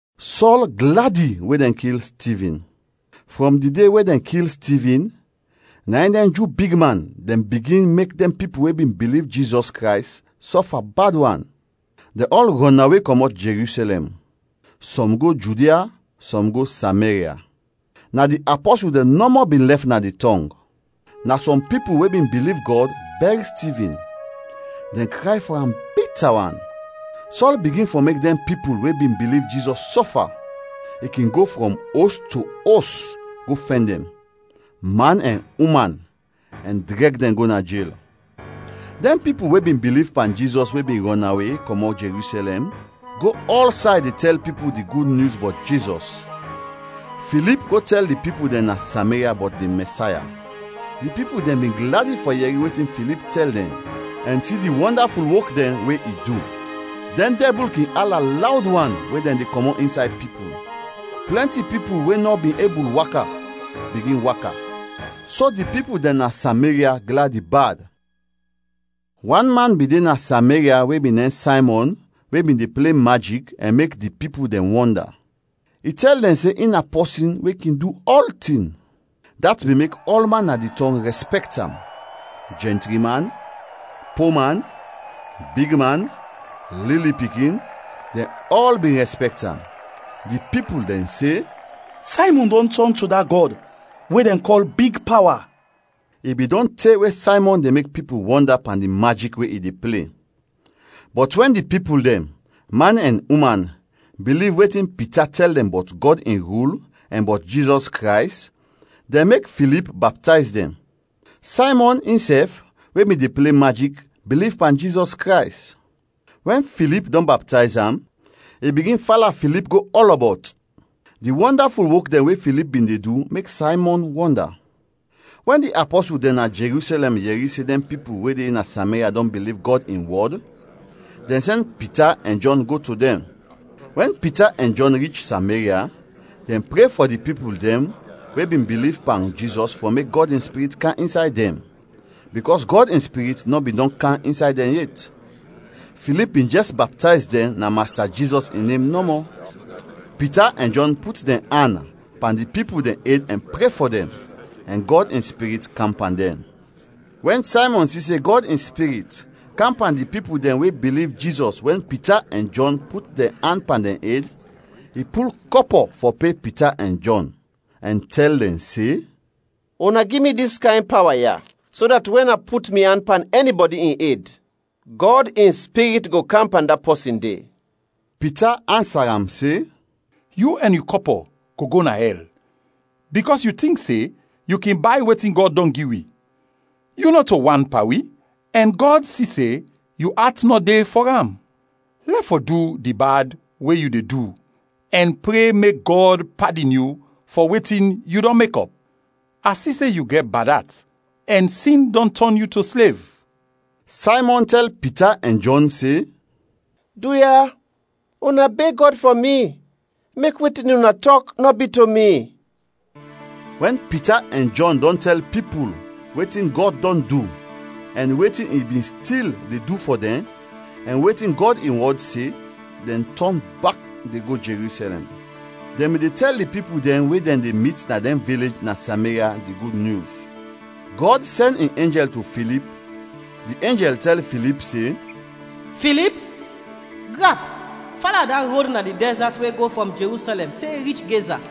Sɔl gladi we dɛn kil Stivin. Frɔm di de we dɛn kil Stivin, na in dɛn Ju bigman dɛn bigin mek dɛn pipul we bin biliv Jizɔs Krays, sɔfa bad wan. Dɛn ɔl rɔnawe kɔmɔt Jerusɛlɛm. Sɔm go Judia, sɔm go Sameria. Na di apɔsul dɛn nɔmɔ bin lɛf na di tɔng. Na sɔm pipul we bin biliv Gɔd, bɛr Stivin; dɛn kray fɔ am bita wan. Sɔl bigin fɔ mek dɛn pipul we bin biliv Jizɔs, sɔfa. I kin go frɔm os to os go fɛn dɛn, man ɛn uman, ɛn drɛg dɛn go na jel. Dɛn pipul we bin biliv pan Jizɔs we bin rɔnawe kɔmɔt Jerusɛlɛm, go ɔlsay de tɛl pipul di Gud Nyus bɔt Jizɔs. Filip go tɛl di pipul dɛn na Sameria bɔt di Mɛsaya. Di pipul dɛn bin gladi fɔ yɛri wetin Filip tɛl dɛn ɛn si di wɔndaful wok dɛn we i du. Dɛn dɛbul kin ala lawd wan we dɛn de kɔmɔt insay pipul. Plɛnti pipul we nɔ bin ebul waka, bigin waka. So di pipul dɛn na Sameria gladi bad. Wan man bin de na Sameria we bin nem Saymɔn we bin de ple majik, ɛn mek di pipul dɛn wɔnda. I tɛl dɛn se in na pɔsin we kin du ɔltin. Dat bin mek ɔlman na di tɔng rɛspɛkt am jɛntri man, po man, bigman, lili pikin dɛn ɔl bin rɛspɛkt am. Di pipul dɛn se, “Saymɔn dɔn tɔn to da gɔd we dɛn kɔl ‘Big Pawa.’” I bin dɔn te we Saymɔn de mek pipul wɔnda pan di majik we i de ple. Bɔt wɛn di pipul dɛn, man ɛn uman, biliv wetin Pita tɛl dɛn bɔt Gɔd in rul ɛn bɔt Jizɔs Krays, dɛn mek Filip baptayz dɛn. Saymɔn, insɛf, we bin de ple majik, biliv pan Jizɔs Krays. Wɛn Filip dɔn baptayz am, i bigin fala Filip go ɔlɔbɔt. Di wɔndaful wok dɛn we Filip bin de du mek Saymɔn wɔnda. Wɛn di apɔsul dɛn na Jerusɛlɛm yɛri se dɛn pipul we de na Sameria dɔn biliv Gɔd in wɔd, dɛn sɛn Pita ɛn Jɔn go to dɛn. Wɛn Pita ɛn Jɔn rich Sameria, dɛn pre fɔ di pipul dɛn we bin biliv pan Jizɔs fɔ mek Gɔd in Spirit kam insay dɛn, bikɔs Gɔd in Spirit nɔ bin dɔn kam insay dɛn yet. Filip bin jɛs baptayz dɛn na Masta Jizɔs in nem nɔmɔ. Pita ɛn Jɔn put dɛn an pan di pipul dɛn ed ɛn pre fɔ dɛn, ɛn Gɔd in Spirit kam pan dɛn. Wɛn Saymɔn si se Gɔd in Spirit kam pan di pipul dɛn we biliv Jizɔs wɛn Pita ɛn Jɔn put dɛn an pan dɛn ed, i pul kɔpɔ fɔ pe Pita ɛn Jɔn ɛn tɛl dɛn se, “Una gi mi dis kayn pawa ya so dat wɛn a put mi an pan ɛnibɔdi in ed, Gɔd in Spirit go kam pan da pɔsin de.” Pita ansa am se, “Yu ɛn yu kɔpɔ go go na ɛl, bikɔs yu tink se yu kin bay wetin Gɔd dɔn gi wi. Yu nɔto wan pan wi ɛn Gɔd si se yu at nɔ de fɔ am. Lɛf fɔ du di bad we yu de du ɛn pre mek Gɔd padin yu fɔ wetin yu dɔn mekɔp. A si se yu gɛt bad at ɛn sin dɔn tɔn yu to slev.” Saymɔn tɛl Pita ɛn Jɔn se, “Duya, una beg Gɔd fɔ mi, mek wetin una tɔk nɔ bi to mi.” Wɛn Pita ɛn Jɔn dɔn tɛl pipul wetin Gɔd dɔn du ɛn wetin i bin stil de du fɔ dɛn, ɛn wetin Gɔd in wɔd se, dɛn tɔn bak de go Jerusɛlɛm; dɛn bin de tɛl di pipul dɛn we dɛn de mit na dɛn vilej na Sameria di Gud Nyus. Gɔd sɛn in enjɛl to Filip, di enjɛl tɛl Filip se, “Filip, grap, fala da rod na di dɛzat we go frɔm Jerusɛlɛm te rich Geza.”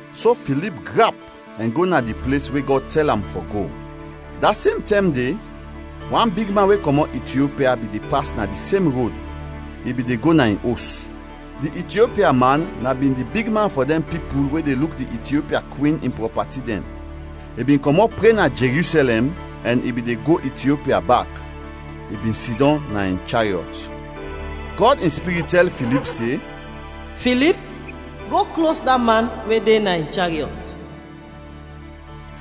So Filip grap ɛn go na di ples we Gɔd tɛl am fɔ go. Da sem tɛm de, wan bigman we kɔmɔt Itiopia bin de pas na di sem rod, i bin de go na in os. Di Itiopia man na bin di bigman fɔ dɛn pipul we de luk di Itiopia kwin in prɔpati dɛn. I bin kɔmɔt pre na Jerusɛlɛm ɛn i bin de go Itiopia bak; i bin sidɔm na in chariɔt. Gɔd in Spirit tɛl Filip se, “Filip, go klos da man we de na in chariɔt.”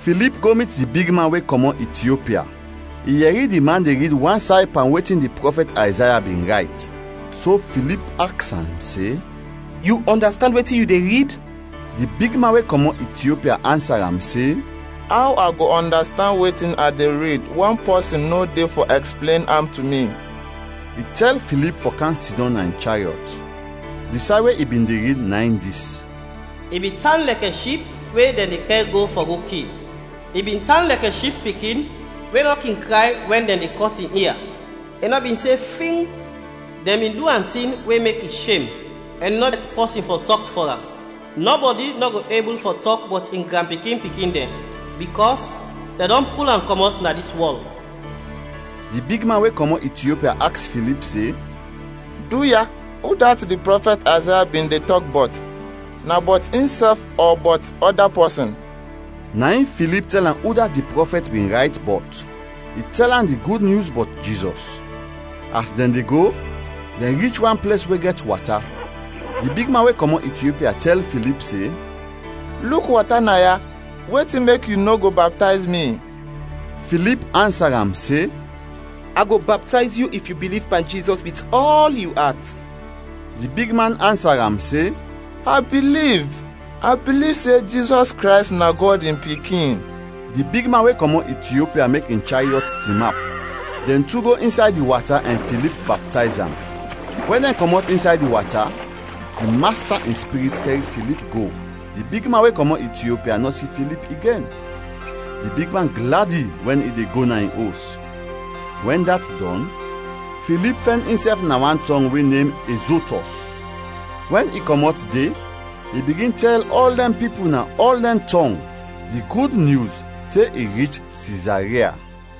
Filip go mit di bigman we kɔmɔt Itiopia, i yɛri di man de rid wan say pan wetin di prɔfɛt Ayzaya bin rayt. So Filip aks am se, “Yu ɔndastand wetin yu de rid?” Di bigman we kɔmɔt Itiopia ansa am se, “Aw a go ɔndastand wetin a de rid wɛn pɔsin nɔ de fɔ ɛksplen am to mi?” I tɛl Filip fɔ kam sidɔm na in chariɔt. Di say we i bin de rid na in dis: “I bin tan lɛkɛ ship we dɛn de kɛr go fɔ go kil. I bin tan lɛkɛ ship pikin we nɔ kin kray wɛn dɛn de kɔt in ia. I nɔ bin se fing. Dɛn bin du am tin we mek i shem ɛn i nɔ bin gɛt pɔsin fɔ tɔk fɔ am. Nɔbɔdi nɔ go ebul fɔ tɔk bɔt in granpikin-pikin dɛn, bikɔs dɛn dɔn pul am kɔmɔt na dis wɔl.” Di bigman we kɔmɔt Itiopia aks Filip se, “Duya udat di prɔfɛt Ayzaya bin de tɔk bɔt? Na bɔt insɛf ɔ bɔt ɔda pɔsin?” Na in Filip tɛl am udat di prɔfɛt bin rayt bɔt, i tɛl am di Gud Nyus bɔt Jizɔs. As dɛn de go, dɛn rich wan ples we gɛt wata. Di bigman we kɔmɔt Itiopia tɛl Filip se, “Luk wata naya, wetin mek yu nɔ go baptayz mi?” [ Filip ansa am se, “A go baptayz yu if yu biliv pan Jizɔs wit ɔl yu at.” Di bigman ansa am se, “A biliv; a biliv se Jizɔs Krays na Gɔd in Pikin.”] Di bigman we kɔmɔt Itiopia mek in chariɔt tinap. Dɛn tu go insay di wata ɛn Filip baptayz am. Wɛn dɛn kɔmɔt insay di wata, di Masta in Spirit kɛr Filip go, di bigman we kɔmɔt Itiopia nɔ si Filip igen. Di bigman gladi wɛn i de go na in os. Wɛn dat dɔn, Filip fɛn insɛf na wan tɔng we nem Ezotɔs; wɛn i kɔmɔt de i bigin tɛl ɔl dɛn pipul na ɔl dɛn tɔng di Gud Nyus te i rich Sizaria.